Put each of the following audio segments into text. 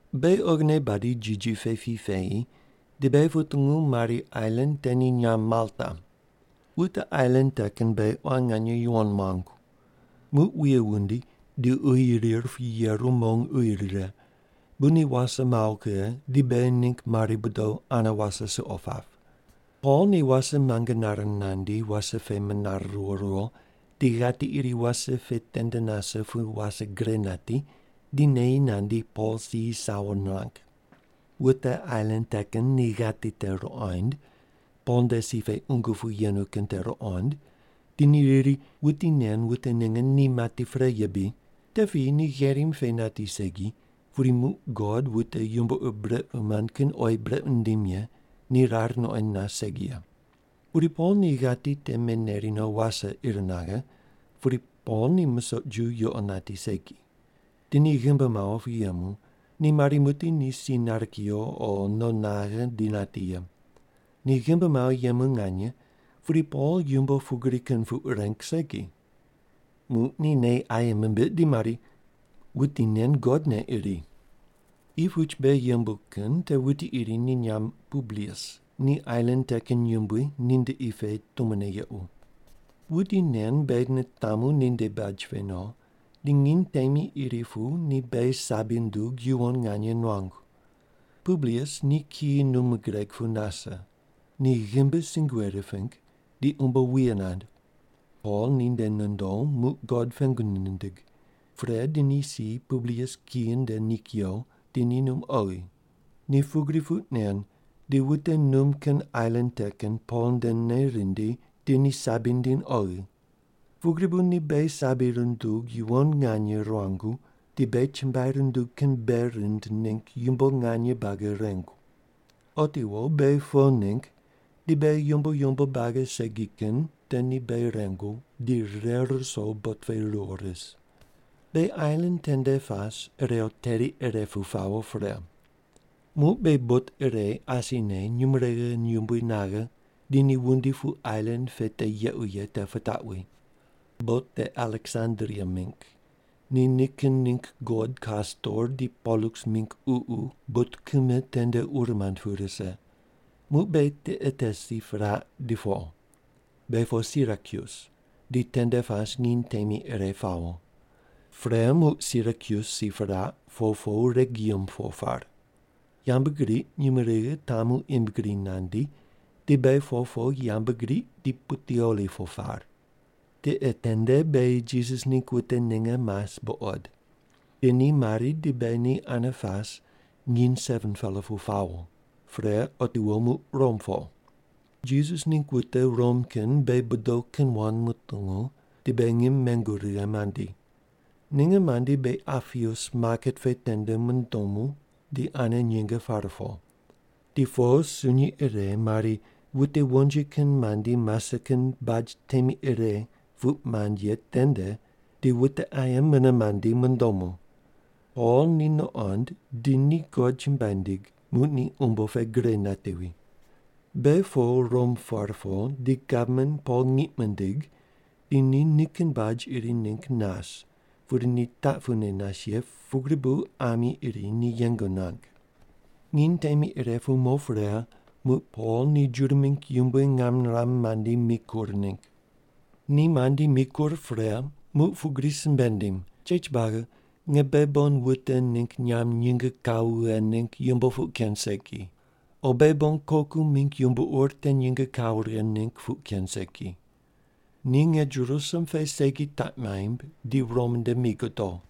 Beghi oghine badi jiji pe pi peyi, di beghi putungu mari ailan te ni nyamb Malta. Wute ailan te kin beghi quan nganye yuwon muangu. Muq wuye wundi, di uyi rir pu yeru mong uyi rire, bu ni wase mawo kughe di beghi ningg mari bodo ane wase suqo pap. Pol ni wase muange nare nandi wase pe menare riwo riwo di ghati iri wase pe tende nase pu wase gre nati, di neyi nandi Pol si sawo nirang. Wute ailan te kin ni ghati te ruqoind, Pol nde si pe qungu pu yenu kin te ruqond di ni riri, “Wuti nen wute ninge ni mati pre ye bri. Te piyi ni gherim pe nati segi, pudi muq god wute yumbo ur brequ mand kin oyi brequ nindim ye ni rar nuqoind nas segi ye.” Pudi Pol ni ghati te meneri no wase ir naghe, pudi Pol ni musoq ju yuqo nati segi. Di ni ghimbi mawo pu yemu, ni mari muqdi ni si nare kuyo o no naghe di nati ye. Ni ghimbi mawo yemu nganye, pudi Pol yumbo pugri kin puq reng segi. Muq ni nei aye mimbiq di mari, “Wuti nen god ne iri.” Qi puch beghi yembu kin te wuti iri ni nyamb Publius ni ailan te kin yumbui ninde qi pe tumone yequ. Wuti nen beghi nitamu ninde baj pe no, di nginy temi iri pu ni beghi sabi nundug yuwon nganye nuangu. Publius ni kiyi num gureg pu nase. Ni ghimbi sungue riping, di umbo wuye nand. Pol ninde nondo, muq God pengu nindig. Pre di ni si Publius kiyi nde ni kuyo, di ni num oghi. Ni pugri puq nen, di wute num kin ailan te kin Pol ndene rindi, di ni sabi nindiny oghi. Pugri bu ni beghi sabi rundug yuwon nganye ruangu di beghi chumbuai rundug kin bei rind ningg yumbo nganye buagi rengu. Otiwo beghi po ningg di beghi yumbo yumbo buagi segi kin te ni beghi rengu, di rire ruso bot pe ruwo ris. Beghi ailan tende pas, irew teri ire pu pawo pre. Muq beghi bot ire asine nyumurighi yumbui naghe di ni wundi pu ailan pe te yequ ye te pitaqwi. Bot te Aleksandria mingg. Ni nikin ningg god Kastor di Poluks mingg ququ bot kime tende ur mand pu rise. Muq beghi tiqe te si piraq di po. Beghi po Sirakyus, di tende pas nginy temi ire pawo. Pre muq Sirakyus si piraq, po po Regium po par. Yambgriq nyumurighi tamu im gri nandi, di beghi po po yambgriq, di Puteoli po par. Tiqe tende beghi Jisas ningg wute ninge mas buqod. Di ni mari, di beghi ni ane pas, nginy 7-pela pu pawo. Pre, otiwo muq Rom po. Jisas ningg wute Rom kin beghi bodo kin wand mutungu, di beghi ngim mengu righe mandi. Ninge mandi beghi Apius maket pe tende mundomu di ane nyinge pare po. Di po sunyi ire mari wute wonji kin mandi mase kin Baj Temi Ire puq mand ye tende di wute aye mune mandi mundomu. Pol ni nuqond, di ni God chumbuai nindig, muq ni umbo pe gre natevi. Beghi po Rom par po, di gavman Pol ngiq mindig, di ni nikin baj iri ningg nas pudi ni taq pune nas ye pugri bu ami iri ni yeng nuang. Nginy temi ire pu mo pre, muq Pol ni Juda mingg yumbui ngam niram mandi mikur ningg. Ni mandi mikur pre, muq pugri simbe nindim, “Chech buagi, nge beghi bon wute ningg nyamb nyinge kawo vighe ningg yumbo puq ken segi. O beghi bon koku mingg yumbo ur te nyinge kawo righe ningg puq ken segi. Ni nge Jerusalem pe segi taq maimb, di Rom nde mi godo.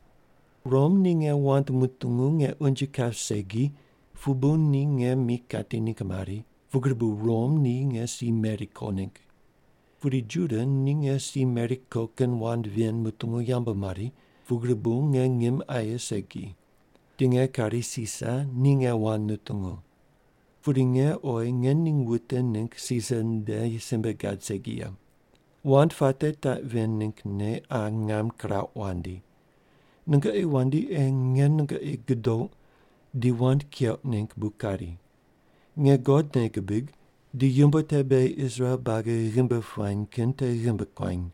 Rom ni nge wand mutungu nge unje kap segi pu bu ni nge mi kati ningg mari, pugri bu Rom ni nge si meri ko ningg. Pudi Juda ni nge si meri ko kin wand ven mutungu yambu mari, pugri bu nge ngim aye segi. Di nge kari Sisar ni nge wand nutungu. Pudi nge oyi nge ning wute ningg Sisar nde simbe gad segi ye. Wand puate taq ven ninggne qa ngam kirauq wandi. Nungoqi wandi ei nge nungoqi gudouq di wand keuq ningg bu kari. Nge God nei gibig, di yumbo te beghi Israel buagi ghimbi puany kin te ghimbi kuany.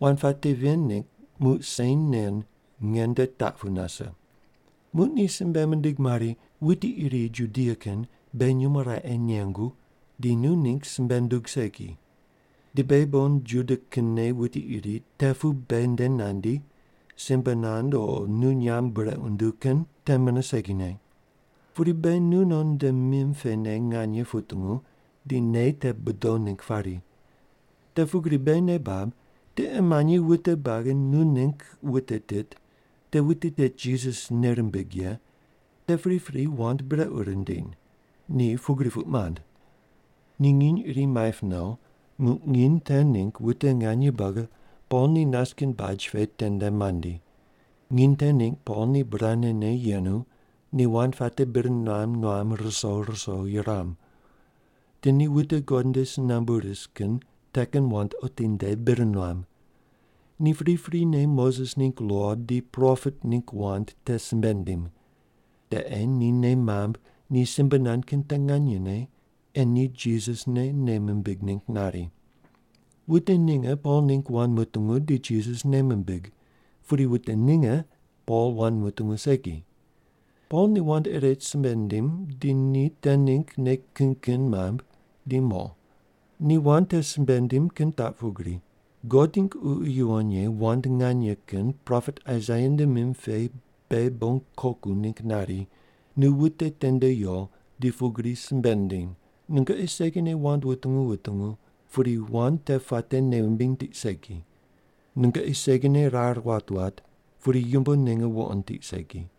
Wand puate ven ningg muq sen nen nge nde taq pu nase.” Muq ni simbe mindig mari, “Wuti iri Judia kin beghi nyumo raqe nengu di nu ningg simbe nundug segi. Di beghi bon Juda kinne wuti iri te pu beghi nde nandi, simbe nand o nu nyamb brequ nunduw kin te mune segine. Pudi beghi nu non nde mim pene nganye putungu di nei te budow ningg pari. Te pugri beghi nei bab, tiqe manyi wute buagi nu ningg wute tit, te wute tit Jisas nei rimbig ye, te pripri wand brequ rindiny.” Ni pugri puq mand. Ni nginy iri maip no, muq nginy te ningg wute nganye buagi Pol ni nas kin baj pe tende mandi. Nginy te ningg Pol ni burane ne yenu, ni wand puate bir nuam nuam ruso ruso yuram. Di ni wute God nde si nambu ris kin te kin wand otinde bir nuam. Ni priprine Moses ningg lo di propet ningg wand te simbe nindim. Te ei ni nei mamb ni simbe nand kin te nganyene, ei ni Jisas ne nei mimbig ningg nari. Wute ninge Pol ningg wand mutungu di Jisas nei mimbig, pudi wute ninge Pol wand mutungu segi. Pol ni wand ire simbe nindim, di ni te ningg nei kin kin mamb di mo. Ni wand te simbe nindim kin taq pugri: “God ningg Ququ Yuwon Ye wand nganye kin propet Aisaia nde mim pe beghi bon koku ningg nari, ‘Nu wute tende yo di pugri simbe ndiny: “Nungoqi segine wand wutungu wutungu, pudi wand te puate nei wumbiny tiq segi. Nungoqi segine rar wat wat, pudi yumbo ninge wuqond tiq segi.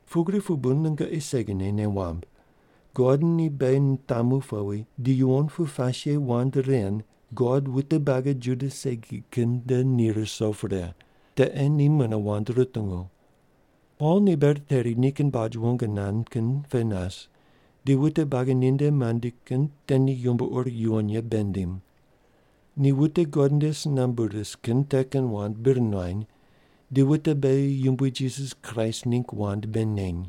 “Pugri pu bu nungoqi segine nei wamb, God ni beghi nitamu powi di yuwon pu pas ye wand ren God wute buagi Juda segi kin nde ni ruso pre. Te ei ni mune wand rutungu.” Pol ni ber teri nikin baj wong nand kin pe nas, di wute buagi ninde mandi kin te ni yumbo ur yuwon ye bei nindim. Ni wute God nde si nambu ris kin te kin wand bir nuany, di wute beghi Yumbui Jisas Kraist ningg wand bei neny.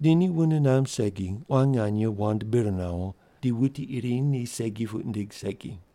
Di ni wune namb segi quan nganye wand bir nawo, di wuti iri ni segi puq nindig segi.